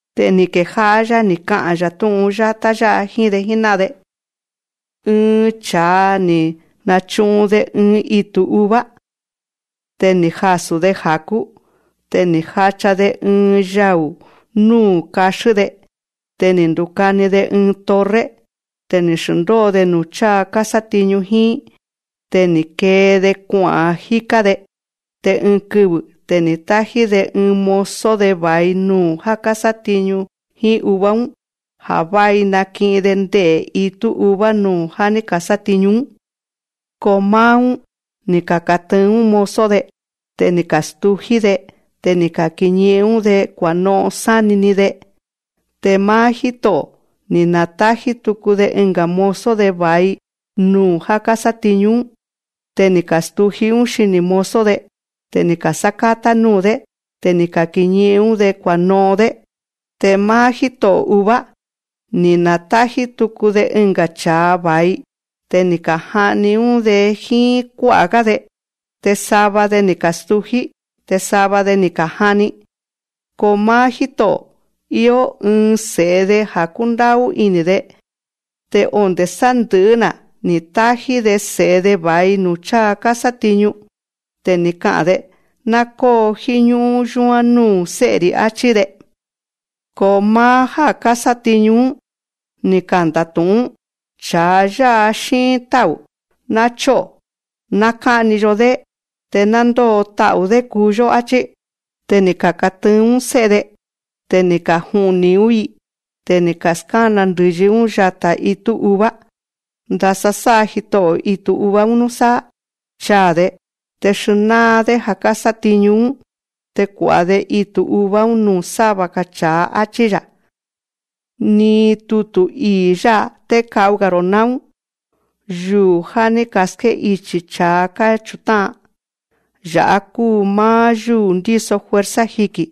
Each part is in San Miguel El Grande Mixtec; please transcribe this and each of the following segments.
Te ni̱ kejá'á‑yá ni̱ ka'a̱n‑ya̱ tú'un yátá jíín‑de jíná'an‑de: Ɨɨn cha̱a, ni̱ nachu'un‑de ɨɨn itu̱ uva. Te ni̱ jasu̱‑de ja̱kú. Te ni̱ jacha‑de ɨɨn yau̱ nuu̱ kaxín‑de. Te ni̱ ndukani‑de ɨɨn torre. Te ni̱ xndóo‑de nuu̱ cháa kásátiñu jíín. Te ni̱ kee‑de kua'a̱n jíká‑de. Te ɨɨn kɨvɨ̱ te ni̱ tájí‑de ɨɨn mozo‑de va̱i nuu̱ já kásátiñu jíín uva‑ún, ja̱ vái naki'in‑de nde'e̱ itú uva nuu̱ já ní ka̱sátiñu‑ún. Ko máá‑ún, ni̱ ka̱katɨɨn‑ún mozo‑de. Te ni̱ ka̱stují‑dé. Te ni̱ ka̱kiñi'in‑ún‑de. kua̱no'on sáni‑ni‑de. Te máá jíto'o̱, ni̱ na̱tájí tuku‑de ɨnga̱ mozo‑de va̱i nuu̱ já kásátiñu‑ún. Te ni̱ ka̱stují‑ún xiní mozo‑de. Te ni̱ ka̱sákátá nuu̱‑dé. Te ni̱ ka̱kiñi'in‑ún‑de kua̱no'on‑dé. Te máá jíto'o̱ uva, ni̱ na̱tájí tuku‑de ɨnga̱ cha̱a va̱i. Te ni̱ ka̱ja'ni‑ún‑de jíín kuá'a̱‑gá‑de. Te sava‑de ni̱ ka̱stují. Te sava‑de ni̱ ka̱ja'ni. Ko máá jíto'o̱, íó ɨɨn se̱'e‑de ja̱ kúndá'ú ini̱‑de. Te onde̱ sandɨ̱'ɨ́‑na̱ ni̱ tájí‑de se̱'e‑de va̱i nuu̱ cháa kásátiñu. Te ni̱ ka'a̱n‑de: Ná kóo jíñú'ún yúán núu̱ sé'e‑ri̱, áchí‑de. Ko máá já kásátiñu‑ún, ni̱ kanda̱tu̱'ún: Cha̱a yá'a xíin tá'u̱. Ná chó'o̱, ná ká'ni‑yo‑dé, te ná ndóo ta'u̱‑dé kuu‑yó, áchí. Te ni̱ ka̱katɨɨn‑ún sé'e‑de. Te ni̱ ka̱ja'ni‑ún‑i. Te ni̱ ka̱skána ndɨ̱yi‑ún yatá itú uva. Ndasa sá'a jito'o̱ itu̱ uva‑ún núsáá. Chaa̱‑de, te xnáa‑dé ja̱ ní ka̱sátiñu‑ún. Te kua̱'a‑de itu̱ uva‑ún nuu̱ sáva‑ga̱ cha̱a, áchí‑ya̱. Ni tutu̱ ii̱ yá'a té ka'u‑ga̱‑ro̱ náún. Yuu̱ já ní ka̱ské'ichi̱ cha̱a káchutá'an, ya̱'á kúu máá yúu̱ ndíso fuerza jiki̱.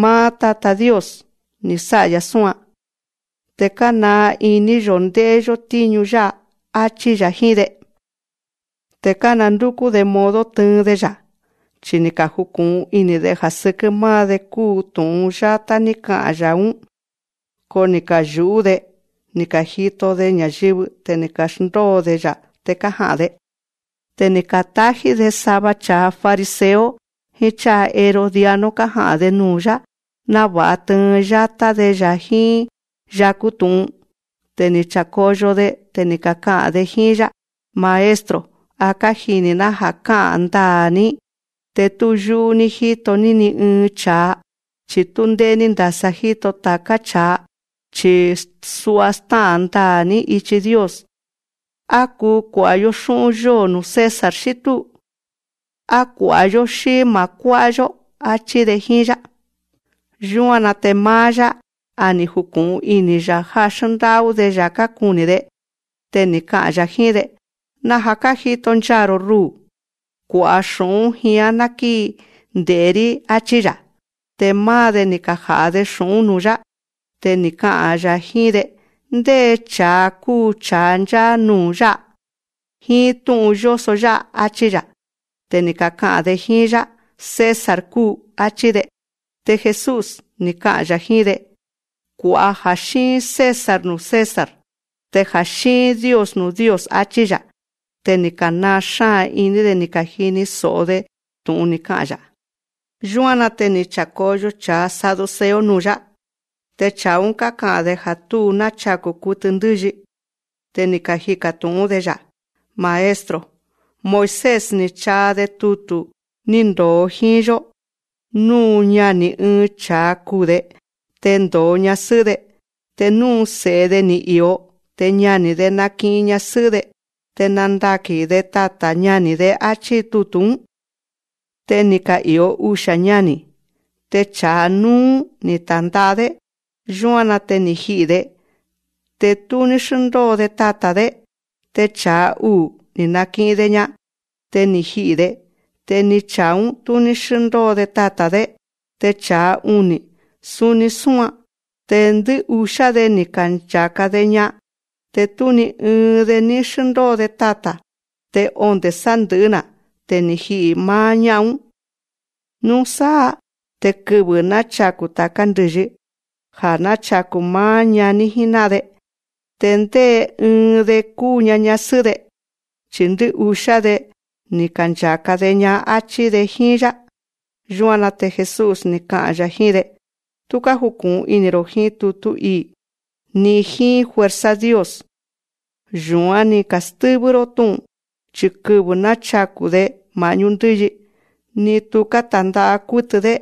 Máá Tatá Dios, ni̱ sá'a‑ya̱ súan. Te kánaa iní‑yo̱ ndé'é‑yó tíñu yá'a, áchí‑ya̱ jíín‑de. Te kándúkú‑de modo tɨɨn‑de‑ya̱. Chi ni̱ kaju̱ku̱'un ini̱‑de ja̱ sɨkɨ́ máá‑de kúu tu̱'un yátá ní ka'a̱n‑ya̱‑ún. Ko ni̱ kayu̱'ú‑de ni̱ ka̱jito‑de ña̱yɨvɨ. Te ni̱ ka̱xndóo‑de‑ya̱, te kája'a̱n‑de. Te ni̱ ka̱tájí‑de sava cha̱a fariseo jíín cha̱a herodiano kája'a̱n‑de nuu̱‑yá, náva̱'a tɨɨn yátá‑de‑ya̱ jíín yakú tu̱'un. Te ni̱ cha̱koyo‑de. Te ni̱ kaka'a̱n‑de jíín‑yá: Maestro, kájini̱‑ná ja̱ ká'a̱n ndaa̱‑ní. Te tú yú'ú‑ní jito‑ní ni ɨɨn cha̱a, chi̱ tú ndé'é‑ní ndasa jíto ta̱ká cha̱a, chi̱ sua stá'a̱n ndaa̱‑ní ichi Dios. Á kuu kua̱'a‑yó xú'ún yóo̱ nuu̱ César, xí túu. Á kua̱'a‑yó, xí ma̱ kuá'a‑yó, áchí‑de jíín‑yá. Yúan‑na te máá‑yá, a ni̱ juku̱'un ini̱‑ya̱ já xndá'ú‑de‑ya̱ kákuni̱‑de. Te ni̱ ka'a̱n‑ya̱ jíín‑de: Naja̱ kájito nchaa̱‑ro̱ rúu̱. Kua̱'a xu̱'ún jián ná kíi nde̱'é‑rí, áchí‑ya̱. Te máá‑de, ni̱ kaja̱'a‑de xu̱'ún‑ún nuu̱‑yá. Te ni̱ ka'a̱n‑ya̱ jíín‑de: Ndé cha̱a kúu cha̱a ncháá nuu̱ yá'a, jíín tú'un yóso yá'a, áchí‑ya̱. Te ni̱ kaka'a̱n‑de jíín‑yá: César kúu, áchí‑de. Te Jesús, ni̱ ka'a̱n‑ya̱ jíín‑de: Kua̱'a ja̱ xíin César nuu̱ César, te ja̱ xíin Dios nuu̱ Dios, áchí‑ya̱. Te ni̱ ka̱naa xáa̱n iní‑de ni̱ ka̱jini so̱'o‑de tu̱'un ni̱ ka'a̱n‑ya̱. Yúan‑na te ni̱ cha̱koyo cha̱a saduceo nuu̱‑yá. Te cha̱a‑ún, káka'a̱n‑de ja̱ tú nachaku̱ kutɨ ndɨ́yi. Te ni̱ kajika̱ tu̱'ún‑de‑ya̱: Maestro. Moisés, ni̱ chaa‑de tutu̱ ni̱ ndo̱o jíín‑yó, nú ñani̱ ɨɨn cha̱a kuu̱‑de, te ndo̱o ñasɨ́'ɨ́‑de, te nú tú se̱'e‑de ní íó, te ñani̱‑de naki'in ñasɨ́'ɨ́‑de, te nandaki̱n‑de tata̱ ñani̱‑de, áchí tutu̱‑ún. Te ni̱ ka'i̱o usia̱ ñani̱. Te cha̱a núú, ni̱ ta̱nda'a‑dé. Yúan‑na te ni̱ ji'i̱‑de. Te tú ní xndóo‑de tata̱‑de. Te cha̱a uu̱, ni̱ naki'in‑de‑ña. Te ni̱ ji'i̱‑de. Te ni cha̱a‑ún, tú ní xndóo‑de tata̱‑de. Te cha̱a uni̱, suni súan. Te ndɨ́'usiá‑de, ni̱ kancha̱ka‑de‑ña. Te tú ni ɨɨn‑de ní xndóo‑de tata̱. Te onde̱ sandɨ̱'ɨ́‑na̱ te ni̱ ji'i̱ máá ñá'an‑ún. Núsáá te kɨvɨ̱ náchaku̱ ta̱ká ndɨ̱yi, ja̱ náchaku̱ máá ñaní jíná'an‑de, te ndé ɨɨn‑de kuu‑ña ñásɨ́'ɨ́‑de, chi̱ ndɨ́'usiá‑de, ni̱ kancha̱ka‑de‑ña, áchí‑de jíín‑yá. Yúan‑na te Jesús, ni̱ ka'a̱n‑ya̱ jíín‑de: Tú kájuku̱'un ini̱‑ro̱ jíín tutú ii̱, ni jíín fuerza Dios. Yu̱án ní ka̱stɨ́vɨ́‑ró tú'un. Chi̱ kɨvɨ̱ náchaku̱‑de ma̱'ñú ndɨ́yi, ni tuká ta̱nda'a kútɨ‑dé,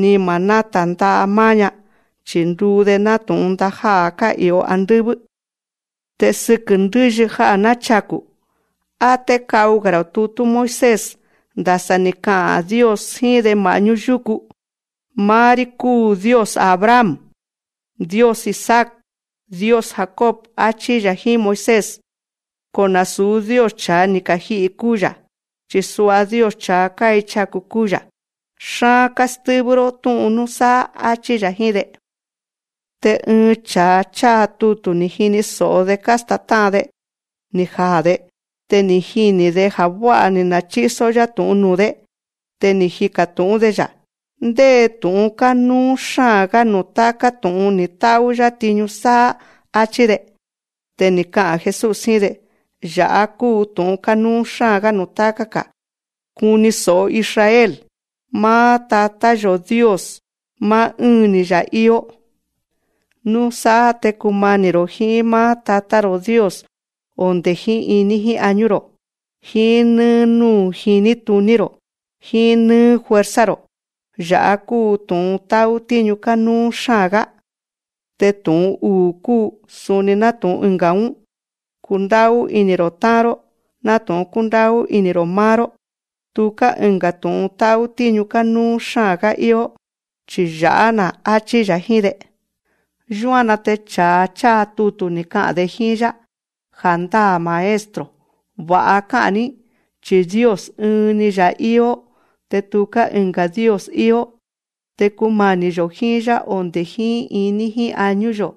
ni ma̱ náta̱nda'a máá‑ña. Chi̱ nduu‑de nátu̱'un ndajá'a̱ ká'i̱o andɨ́vɨ́. Te sɨkɨ̱ ndɨ́yi ja̱ náchaku̱, á té ka'u‑ga̱‑ro̱ tutú Moisés, ndasa ni̱ ka'a̱n Dios jíín‑de ma̱'ñú yukú: Máá‑rí kúu Dios Abraham, Dios Isaac, Dios Jacob, áchí‑ya̱ jíín Moisés. Ko nasu̱ Dios cha̱a ni̱ kaji'i̱ kúu‑ya̱, chi̱ sua Dios cha̱a káichaku̱ kúu‑ya̱. Xaa̱n kástɨ́vɨ́‑ró tú'un núsáá, áchí‑ya̱ jíín‑de. Te ɨɨn cha̱a cháa tutu̱ ni̱ jini so̱'o‑de kástátá'an‑de, ni̱ jaa̱‑de. Te ni̱ jini̱‑de ja̱ vá'a ni̱ nachísó‑yá tu̱'un nuu̱‑dé. Te ni̱ jika̱ tu̱'ún‑de‑ya̱: Ndé tu̱'un kánúú xáa̱n‑gá nuu̱ táká tu̱'un ni̱ tá'ú‑yá tiñu sáá, áchí‑de. Te ni̱ ka'a̱n Jesús jíín‑de: Ya̱'á kúu tu̱'un kánúú xáa̱n‑gá nuu̱ táká‑ga̱: Kuni so̱'o Israel, máá Tatá‑yo̱ Dios, máá ɨ́ɨn‑ni‑ya̱ íó. Núsáá te kumani̱‑ro̱ jíín máá Tatá‑ro̱ Dios onde̱ jíín iní jíín añú‑ro̱, jíín nɨ́ɨ́ núu̱ jiní tuní‑ro̱, jíín nɨ́ɨ́ fuerza‑ro̱. Ya̱'á kúu tu̱'un tá'ú tíñu kánúú xáa̱n‑gá. Te tu̱'un uu̱ kúu suni nátu̱'un ɨnga̱‑ún: Kundá'ú ini̱‑ro̱ tá'an‑ró nátu̱'un kúndá'ú ini̱‑ro̱ máá‑ró. Tuká ɨnga̱ tu̱'un tá'ú tíñu kánúú‑ga̱ íó, chi ya̱'á‑na̱, áchí‑ya̱ jíín‑de. Yúan‑na te cha̱a cháa tutu̱, ni̱ ka'a̱n‑de jíín‑yá: Ja̱ndáa̱ Maestro, va̱'a ká'a̱n‑ní, chi̱ Dios ɨɨn‑ni‑ya̱ íó, te tuká ɨnga̱ Dios íó. Te kumani̱‑yo̱ jíín‑yá onde̱ jíín iní jíín añú‑yo̱,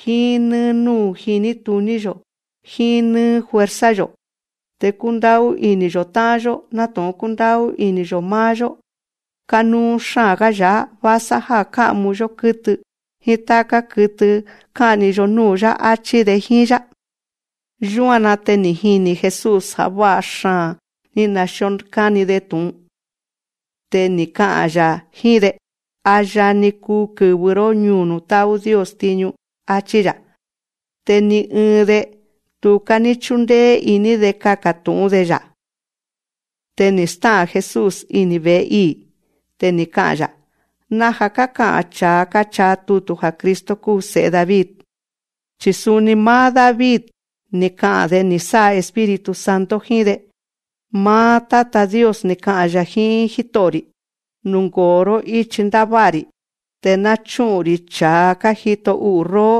jíín nɨ́ɨ́ núu̱ jiní tuní‑yo̱, jíín nɨ́ɨ́ fuerza‑yo̱, te kundá'ú ini̱‑yo̱ tá'an‑yó nátu̱'un kúndá'ú ini̱‑yo̱ máá‑yó, kánúú xáa̱n‑gá ya̱'á vásá já ká'mu‑yó kɨ́tɨ jíín táká kɨtɨ ká'ni‑yo núu̱‑yá, áchí‑de jíín‑yá. Yúan‑na te ni̱ jini̱ Jesús ja̱ vá'a xaa̱n ní xndíó káni‑de tu̱'un. Te ni̱ ka'a̱n‑ya̱ jíín‑de: A yani kuu kɨ̱vɨ‑ró ñúu̱ nuu̱ tá'ú Dios tiñu, áchí‑ya̱. Te ni ɨɨn‑de, tuká ní chúndéé iní‑de kaka̱ tu̱'ún‑de‑ya̱: Te ni̱ stá'a̱n Jesús ini̱ ve̱'e ii̱. Te ni̱ ka'a̱n‑ya̱: Naja̱ káka'a̱n cha̱a káchaa tutu̱ ja̱ Cristo kúu Se̱'e David. Chi̱ suni máá David, ni̱ ka'a̱n‑de ni̱ sá'a Espíritu Santo jíín‑de: Máá Tatá Dios ni̱ ka'a̱n‑ya̱ jíín Jíto'o̱‑ri̱: Nungo̱o‑ró íchi ndává'a‑ri̱, te ná chúkú‑rí cha̱a kájito u'u̱ róó,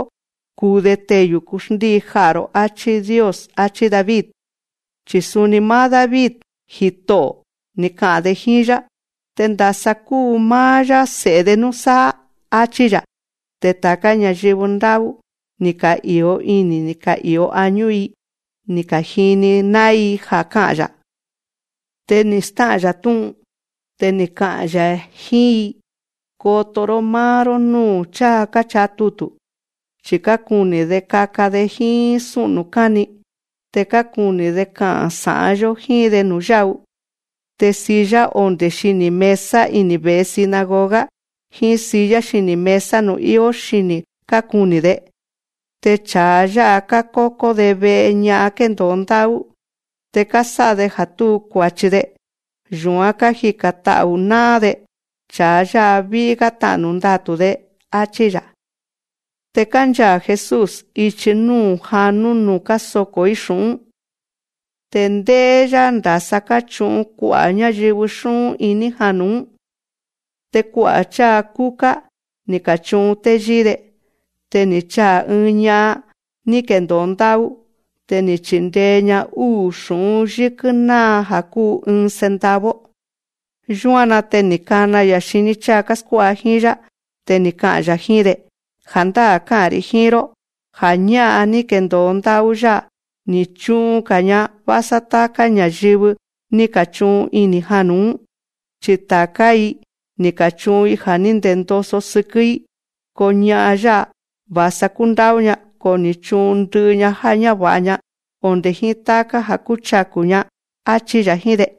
kuu‑de teyu̱ kuxndíi ja'a̱‑ro̱, áchí Dios. Achí David. Chi̱ suni máá David, Jito'o̱, ni̱ ka'a̱n‑de jíín‑yá. Te ndasa kuu máá‑yá se̱'e‑de núsáá, áchí‑ya̱. Te ta̱ká ña̱yɨvɨ ndá'ú, ni̱ ka'i̱o ini̱ ni̱ ka'i̱o añú‑i ni̱ ka̱jini ná'ín‑i ja̱ ká'a̱n‑ya̱. Te ni̱ stá'a̱n‑ya̱ tú'un. Te ni̱ ka'a̱n‑ya̱ jíín‑i: Koto‑ró máá‑ró núu̱ cháa káchaa tutu̱. Chi̱ kákuni̱‑de kaka‑de jíín sú'nu̱ káni. Te kákuni̱‑de ja̱ ká'a̱n sa̱'án‑yo̱ jíín‑de nu̱yá'u. Te silla onde̱ xini̱ mesa ini̱ ve̱'e sinagoga, jíín silla xini̱ mesa nuu̱ íó xíni kákuni̱‑de. Te cha̱a yá'a kákókó‑de ve'e ña'an kéndo̱o ndá'ú, te kásá'a‑de ja̱ túu kua̱chi‑de, yu̱án kájika̱n ta'u̱ ná'án‑de. Cha̱a yá'a ví'í‑gá ta'nu̱ ndatu̱‑de, áchí‑ya̱. Te kánchaa̱ Jesús ichi núu̱ janú nuu̱ kásoko̱‑í xu̱'ún. Te ndé'é‑yá ndasa káchu'un kua'a̱ ñáyɨvɨ xú'ún iní janu̱‑ún. Te kua'a̱ cháa kúká, ni̱ ka̱chu'un téyíí‑de. Te ni̱ chaa̱ ɨɨn ña'an ní kendo̱o ndá'ú. Te ni̱ chindee‑ña úu̱ xu̱'ún yɨ́kɨ́ náa, ja̱ kúu ɨɨn centavo. Yúan‑na te ni̱ kana‑ya̱ xiní cháa káskuá'a jíín‑yá. Te ni̱ ka'a̱n‑ya̱ jíín‑de: Ja̱ndáa̱ ká'a̱n‑ri̱ jíín‑ró, ja̱ ñá'an ní kendo̱o ndá'ú yá'a, ni̱ chu'un‑ga̱‑ña vásá táká ña̱yɨvɨ ní ka̱chu'un ini̱ janu̱‑ún. Chi ta̱ká‑i, ni̱ ka̱chu'un‑i ja̱ ní ndendoso sɨkɨ́‑í. Ko ña'an yá'a, va̱sa kúndá'ú‑ña, ko ni̱ chu'un ndɨ'ɨ‑ña já ñáva̱'a‑ña, onde̱ jíín táká ja̱ kúchaku̱‑ña, áchí‑ya̱ jíín‑de.